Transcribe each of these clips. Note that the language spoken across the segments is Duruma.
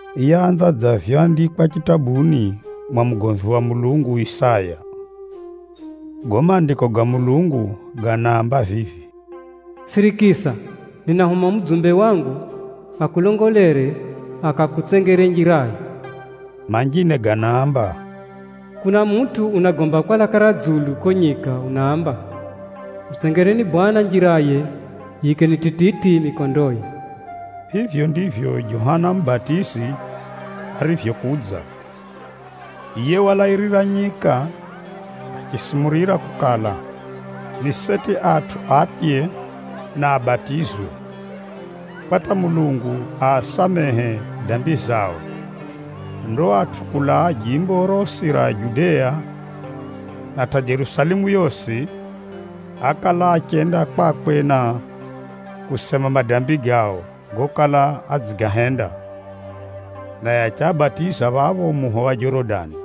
yaanza dza vyoandikwa chitabuni mwa mugomvi wa Mulungu Isaya. Gago Maandiko ga Mulungu ganaamba vivi, “Sirikisa, ninahuma mudzumbe wangu akulongolere, akakutsengere njirayo.” Manjine ganaamba, “Kuna mutʼu unagomba kwa laka ra dzulu kuko nyika unaamba, ‘Mutsengereni Bwana Mulungu njiraye, yiikeni tititi mikondoye!’” Vivyo, ndivyo Johana Mubatizi arivyokudza. Yiye walairira nyika, achisumurira kukala, ni seti atʼu atye na abatizwe, kwa hata Mulungu aasamehe dambi zao. Ndo atʼu kulaa jimbo rosi ra Judea, na hata Jerusalemu yosi, ákala achenda kwakwe, na kusema madambi gao gokala adzigahenda, naye achiabatiza phapho muho wa Jorodani.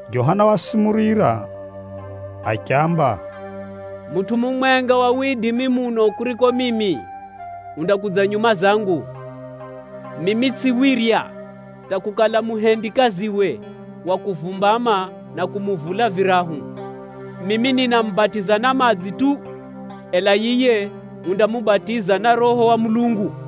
Johana wasumurira achiamba, “Mutʼu mumwenga wa widimi muno kuriko mimi, undakudza nyuma zangu. Mimi tsʼiwirya hata kukala muhendikaziwe wa kuvumbama na kumuvula virahu. Mimi ninamubatiza na madzi tu! Ela yiye undamubatiza na Roho wa Mulungu.”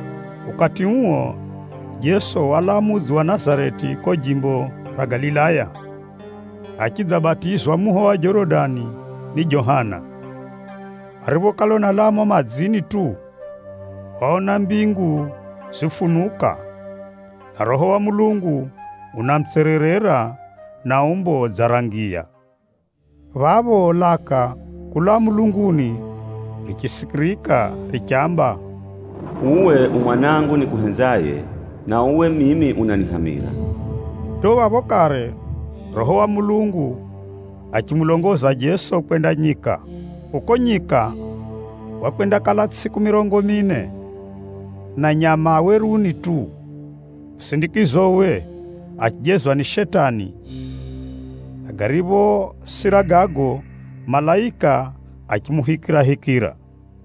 Ukati uo, Jeso walaa mudzi wa Nazareti kuko jimbo ra Galilaya, achidzabatizwa muho wa Jorodani ni Johana. Ariphokala unalaa mumo madzini tu, waona mbingu zifunuka, na Roho wa Mulungu unamutsererera na umbo dza ra ngiya na achidzamudulama. Phapho, laka kulaa mulunguni richisikirika richamba, “Uwe u Mwanangu nikuhenzaye, na uwe mimi unanihamira.” Ndo phapho kare, Roho wa Mulungu achimulongoza Jeso kwenda nyika. Kuko nyika, wakwendakala tsʼiku mirongo mine na nyama a weruni tu. Musindikizowe, achijezwa ni Shetani, na gariphosira gago, malaika achimuhikirahikira.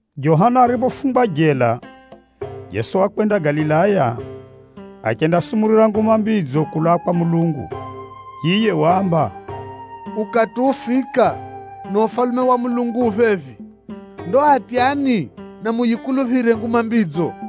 Johana ariphofungwa jela, Jeso wakwenda Galilaya, achendasumurira Nguma Mbidzo kulaa kwa Mulungu. Yiye waamba, “Ukati ufika, na Ufalume wa Mulungu ufika phephi. Ndo atyani, na muyikuluphire Nguma Mbidzo!”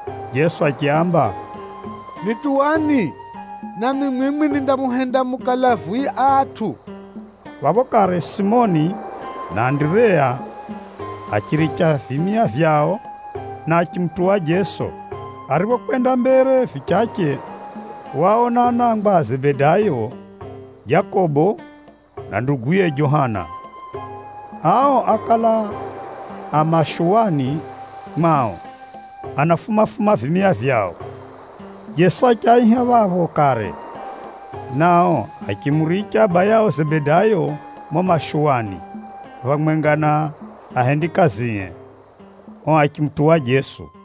Jeso achiaamba, “Nituwani, nami mwimwi nindamuhenda mukale avuwi a atʼu.” Phapho kare Simoni na Andireya achiviricha vimia vyao, achimutuwa Jeso. Ariphokwenda mbere vichache, waona anangwa a Zebedayo, Jakobo na nduguye Johana. Ao ákala a mashuwani mwao anafuma-fuma vimia vyao. Jeso achiaiha phapho kare, nao achimuricha abayao Zebedayo mumo mashuwani phamwenga na ahendikazie, ao achimutuwa Jeso.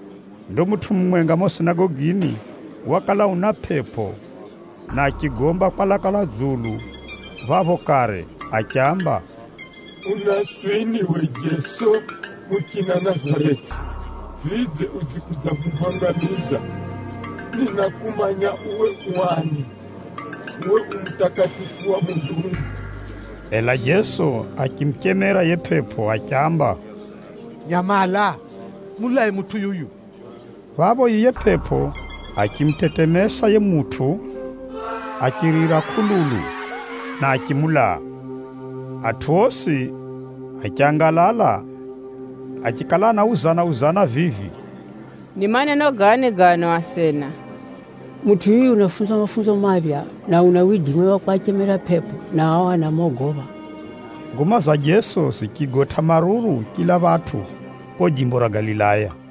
Ndo mutʼu mumwenga mumo sinagogini wakala una pʼepʼo, na achigomba kwa laka ra dzulu phapho kare achiamba, “Unaswini uwe Jeso muchina Nazareti? Vidze, udzikudzahuhangamiza? Ninakumanya uwe u ani. Uwe u Mutakatifu wa Mulungu!” Ela Jeso achimuchemera yiye pʼepʼo achiamba, “Nyamala! Mulae mutʼu yuyu!” Phapho yiye pʼepʼo achimutetemesa yiye mutʼu, achirira kʼululu, na achimulaa. Atʼu osi achangalala, achikala anauzana-uzana vivi, “Ni maneno gani gano asena? Mutʼu yuyu unafunza mafunzo maphya, na una widimi wa kwachemera pʼepʼo, na ao anamogopha!” Nguma za Jeso zichigotʼa maruru chila phatʼu kuko jimbo ra Galilaya.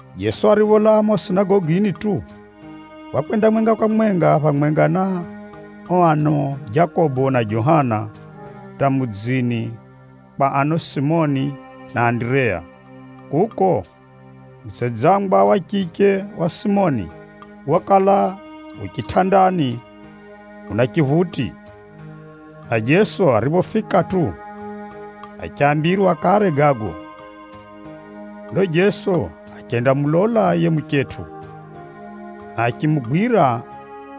Jeso aripholaa mumo sinagogini tu, wakwenda mwenga kwa mwenga phamwenga na ao ano Jakobo na Johana hata mudzini kwa ano Simoni na Andireya. Kuko, mutsedzangwa wa chiche wa Simoni, wakala yu chitʼandani una chiphuti, na Jeso ariphofika tu, achambirwa kare gago. Ndo Jeso achendamulola yiye muchetʼu, na achimugwira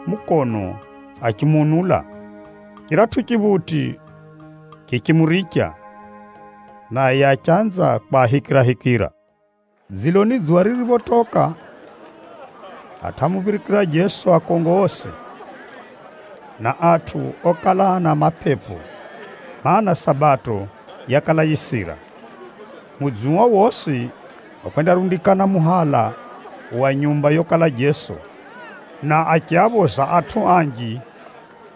mukono achimuunula. Chiratʼu chiphuti chichimuricha, naye achanza kwahikirahikira. Dziloni dzuwa ririphotoka, atʼu ámuphirikira Jeso akongo osi, na atʼu okala ana mapepo, mana, Sabato yakala yisira. Mudzi uo wosi wakwendarundikana muhala wa nyumba yokala Jeso, na achiaphoza atʼu anji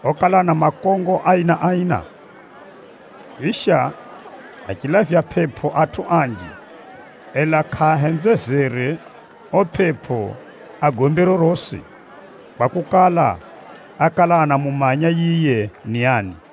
okala ana makongo aina-aina. Chisha, achilavya pʼepʼo atʼu anji, ela kʼaahenzezere ao pʼepʼo agombe rorosi, kwakukala, ákala anamumanya yiye ni ani.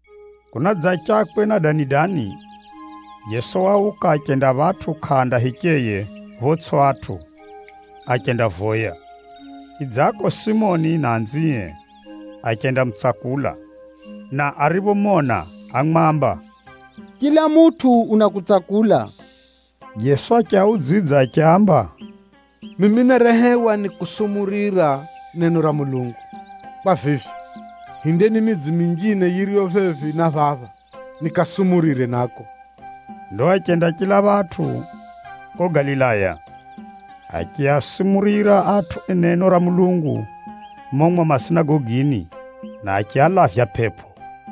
Kunadzachakwe na dani-dani, Jeso wauka, achenda phatʼu kʼanda hicheye photsʼi atʼu, achendavoya. Chidzako, Simoni na anzie achendamutsakula, na ariphomona, ámwamba, “Chila mutʼu unakutsakula.” Jeso achiaudzidza achiaamba, “Mimi nárehewa ni kusumurira neno ra Mulungu. Kwa vivyo, hindeni midzi minjine yiriyo phephi na phapha, nikasumurire nako.” Ndo achenda chila phatʼu kuko Galilaya, achiasumurira atʼu neno ra Mulungu mumo mwao masinagogini, na achialavya pʼepʼo.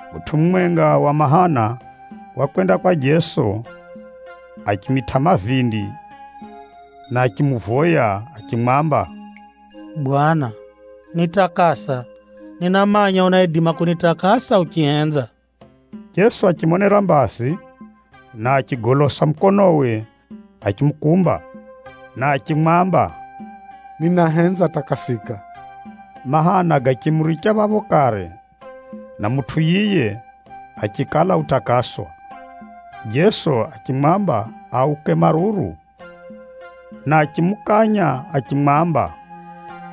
Mutʼu mumwenga wa mahana wakwenda kwa Jeso, achimitʼa mavindi na achimuvoya achimwamba, “Bwana, nitakasa. Ninamanya unaidima kunitakasa uchihenza!” Jeso achimonera mbazi, na achigolosa mukonowe achimukumba, na achimwamba, “Ninahenza, takasika!” Mahana gachimuricha phapho kare, na mutʼu yiye achikala utakaswa. Jeso achimwamba auke maruru, na achimukanya achimwamba,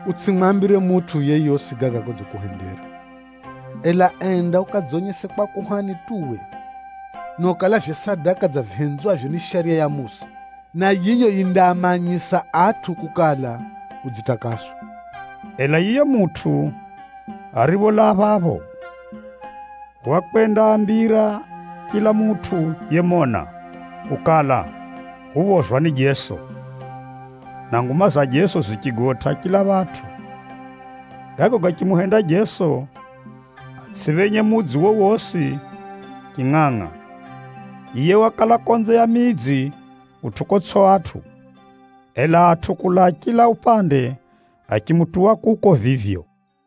“Utsʼimwambire mutʼu yeyosi gaga godzikuhendera. Ela enda ukadzonyese kwa kuhani tu uwe, na ukalavye sadaka dza vihenzwavyo ni Shariya ya Musa, na yiyo yindaamanyisa atʼu kukala, udzitakaswa.” Ela yiye mutʼu aripholaa phapho, wakwendaambira chila mutʼu yemona, kukala, uphozwa ni Jeso. Na nguma za Jeso zichigotʼa chila phatʼu. Gago gachimuhenda Jeso atsʼiphenye mudzi wowosi chingʼangʼa. Yiye wakala konze ya midzi kutʼu kotsʼi atʼu, ela atʼu kulaa chila upande, achimutuwa kuko vivyo.